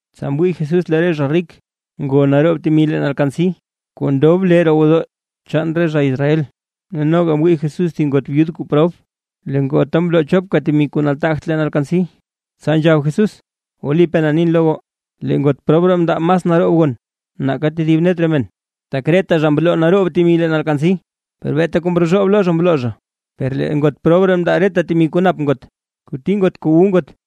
Tsa mwii Jesús lee re zha rik ngo naroob temi leen alkansi kuu ndob lee roo gwodoo chaan re zha Israel. Ne noga mwii Jesús thib ngot byud kuu prob. Lee ngota mloo chopka temi kuu nataagt leen alkansi. Tsa nzhab Jesús: ―Wlipaa na nin lo goo, lee ngot prob ree mndaa mas naroob gon nake tedib net re men. Tak reta zha mloo naroob temi leen alkansi, per beeta kuu mrozhoob lo zha mloo zha. Per lee ngot prob ree mndaa reta temi kuu nap ngot, kuu tii ngot kuu wu ngot.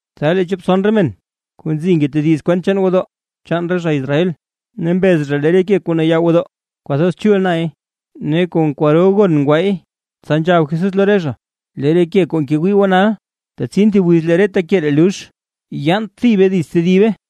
Tsa lee chop tson re men kuu nzi ngetediz kwent chaan gwodoo chaan re zha Israel. Ne mbez zha lee re ke kuu naya gwodoo kwathoz chul nay, ne kon kwaro gon ngway. Tsa nzhab Jesús lo re zha: ―Lee re ke kuu ngewii goo nal, tetsin thib wiz lee reta ke ree lux, yaant thibe dits tedibe.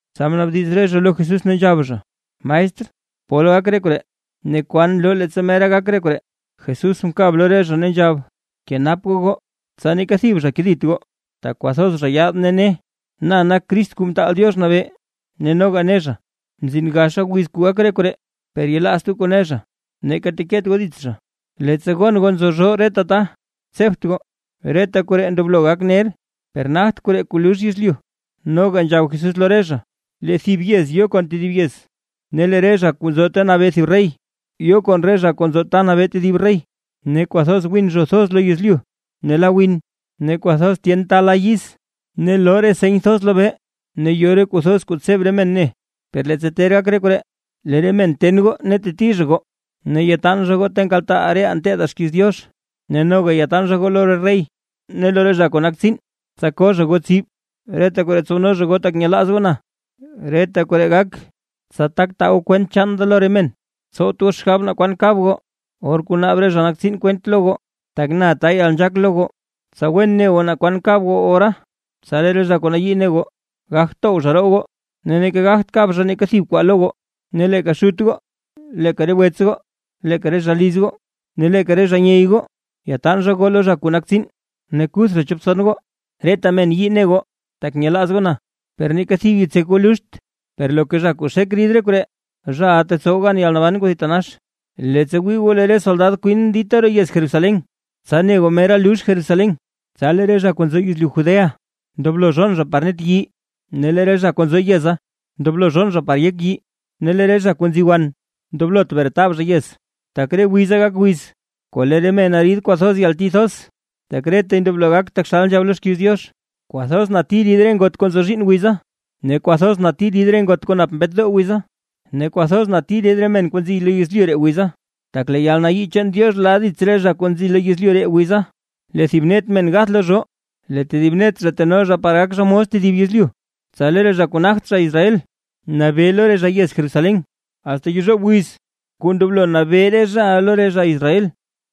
Tsa mnaabdiz re zha lo Jesús, ne nzhab zha: ―Maestr, ¿pol gak re koree? Ne, ¿kwan loo leettsa mera gak re koree? Jesús mkab lo re zha, ne nzhab: ―Kenap goo goo, tsa neeka thib zha kedit goo. Tak kwathoz zha yaad ne ne: “Na nak Crist Kuu Mtaal Diox Nabee”. Ne noga ne zha: “Mzin gaxa wiz kuu gak re koree”, per yelaazt goo kuu ne zha neeka teket goo dits zha. Leettsa gon goo nzo zhoo reta ta, tsebt goo. Reta koree ndoblo gak ner; per nagt koree kuu lux yezlyu. Noga nzhab Jesús lo re zha: ―Lee thib yez yo kon tedib yez, ne lee re zha kuu nzo ta nabee thib rey yo kon re zha kuu nzo ta nabee tedib rey. Ne kwathoz gwin zho thoz lo yezlyu, ne la win, ne kwathoz tyen ta la yiz, ne loo re seny thoz lobee, ne yo re kuu thoz kuu tseb re men ne. Per leettsa ter gak re koree, lee re men ten goo ne teti zha goo, ne yataan zha goo ta nkaltaa reʼaa nteedaa xkiiz Diox, ne noga yataan zha goo lo re rey, ne lo re zha kuu nak tsiin tsa ko zha goo tsib. Reta koree tsowno zha goo tak nyelaaz goo na. Reta koree gak tsa tak taa goo kwent chaan da lo re men. Tsowt goo xgab naa kwan kab goo, or kuu naab re zha kuu nak tsiin kwent lo goo. Tak na ta yalnzhaak lo goo, tsa wen ne goo naa kwan kab goo ora; tsa lee re zha kuu nayii ne goo, gagt tow zha roo goo ne neeka gagt kab zha neeka thib kwaa lo goo. Ne leeka xut goo, leeka re wets goo, leeka re zha liz goo, ne leeka re zha nyey goo, yataan goo lo zha kuu nak tsiin. Ne kuth zha chop tson goo. Reta men yii ne goo, tak nyelaaz goo na. Per neeka thib yitsek goo luxt. Per loka zha kuu xek rid re koree, zhaʼa tetsow gan yalnaban kuu thitanax. ’Leettsa wii goo lee re soldad kwin dita roo yez Jerusalén, tsa ne goo mera lux Jerusalén. Tsa lee re zha kuu nzo yezlyu Judea ndoblo zhonn zha par net yii, ne lee re zha kuu nzo yeza ndoblo zhonn zha par yek yii, ne lee re zha kuu nzi wan, ndoblot bretab zha yez. Tak re wiza gak wiz kuu lee re mena rid kwathoz yalti thoz, tak retay ndoblo gak taxal nzhab lo xkiiz Diox. Kwathoz nati rid re ngot kuu nzo zhiinn wiza. Ne kwathoz nati rid re ngot kuu nap mbetdoo wiza, ne kwathoz nati rid re men kuu nzi lo yezlyu ree wiza, tak lee yalnayii chaan Diox la dits re zha kuu nzi lo yezlyu ree wiza. Lee thib net re men gath lo zhoo, ne lee tedib net zha teno zha zha par gak zha mos tedib yezlyu. Tsa lee re zha kuu nagt zha Israel nabee lo re zha yez Jerusalén, asta yezhoob wiz kuu ndoblo nabee re zhaʼa lo re zha Israel.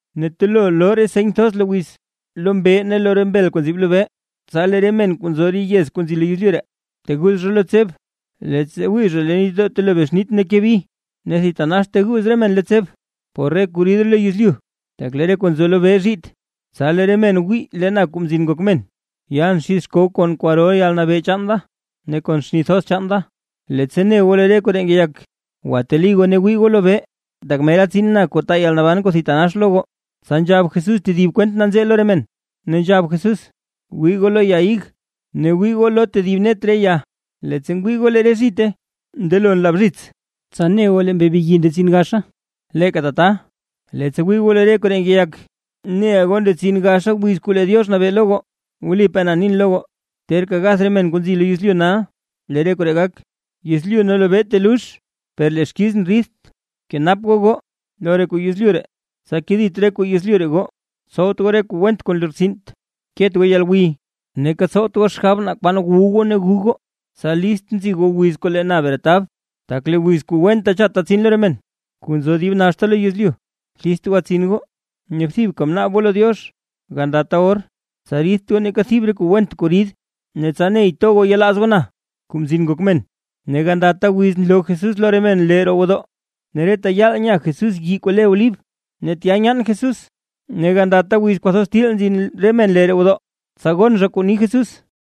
’Ne telo loo re seny thoz lo wiz, lo mbee ne lo re mbel kuu nzib lobee. Tsa lee re men kuu nzo re yez kuu nzi lo yezlyu ree, teguz zha lo tseb leettsa wii zha lee nitdoo telo bexnit ne ke bi. Ne thitanax teguz re men lo tseb, por re kuu rid lo yezlyu, tak lee re kuu nzo lobee zhiit. Tsa lee re men wii, lee na Kuu Mzin Ngok Men, yalʼn xid xkow kon kwaro yalnabee chaan da ne kon xni thoz chaan da. Leettsa ne goo lee re koree ngeyak, gwateli goo ne wii goo lobee, tak mera tsin na kuu taa yalnaban kuu thitanax lo goo. Tsa nzhab Jesús tedib kwent nanzee lo re men, ne nzhab Jesús: ―Wii goo lo ya ig ne wii goo lo tedib net re ya. Leettsa ngwii goo lee re zhite ndelo la bzhits, tsa ne goo lee mbee beyi ndetsin gaxa. Leeka tata, leettsa wii goo lee re koree ngeyak, neʼa goo ndetsin gaxa wiz kuu lee Diox nabee lo goo. Wlipaa na nin lo goo, terka gath re men kuu nzi lo yezlyu nal ne lee re koree gak. Yezlyu ne lobee telux per lee xkizʼn ridt. ’Bkenap goo goo, lo re kuu yezlyu ree, tsa kedit re kuu yezlyu ree goo, tsowt goo re kuu went kuu nlortsint, keet goo yalgwiy, neeka tsowt goo xgab naa kwan wu goo ne gu goo, tsa lista nzi goo wiz kuu lee na bretab, tak lee wiz kuu wenta chatta tsin lo reta men kuu nzo dib naxta lo yezlyu. List gwatsin goo, ne thibka bnaab goo lo Diox gandata or, tsa ridt goo neeka thib re kuu went kuu rid, ne tsa ney to goo nyelaaz goo na, Kuu Mzin Ngok Men. Ne gandata wiz nloo Jesús lo re men lee roo gwodoo, ne reta yaal nya Jesús yii kuu le Olib, ne tya nyaan Jesús. Ne gandata wiz kwathoz til nzin re men lee roo gwodoo, tsa gon zha kuu ni Jesús.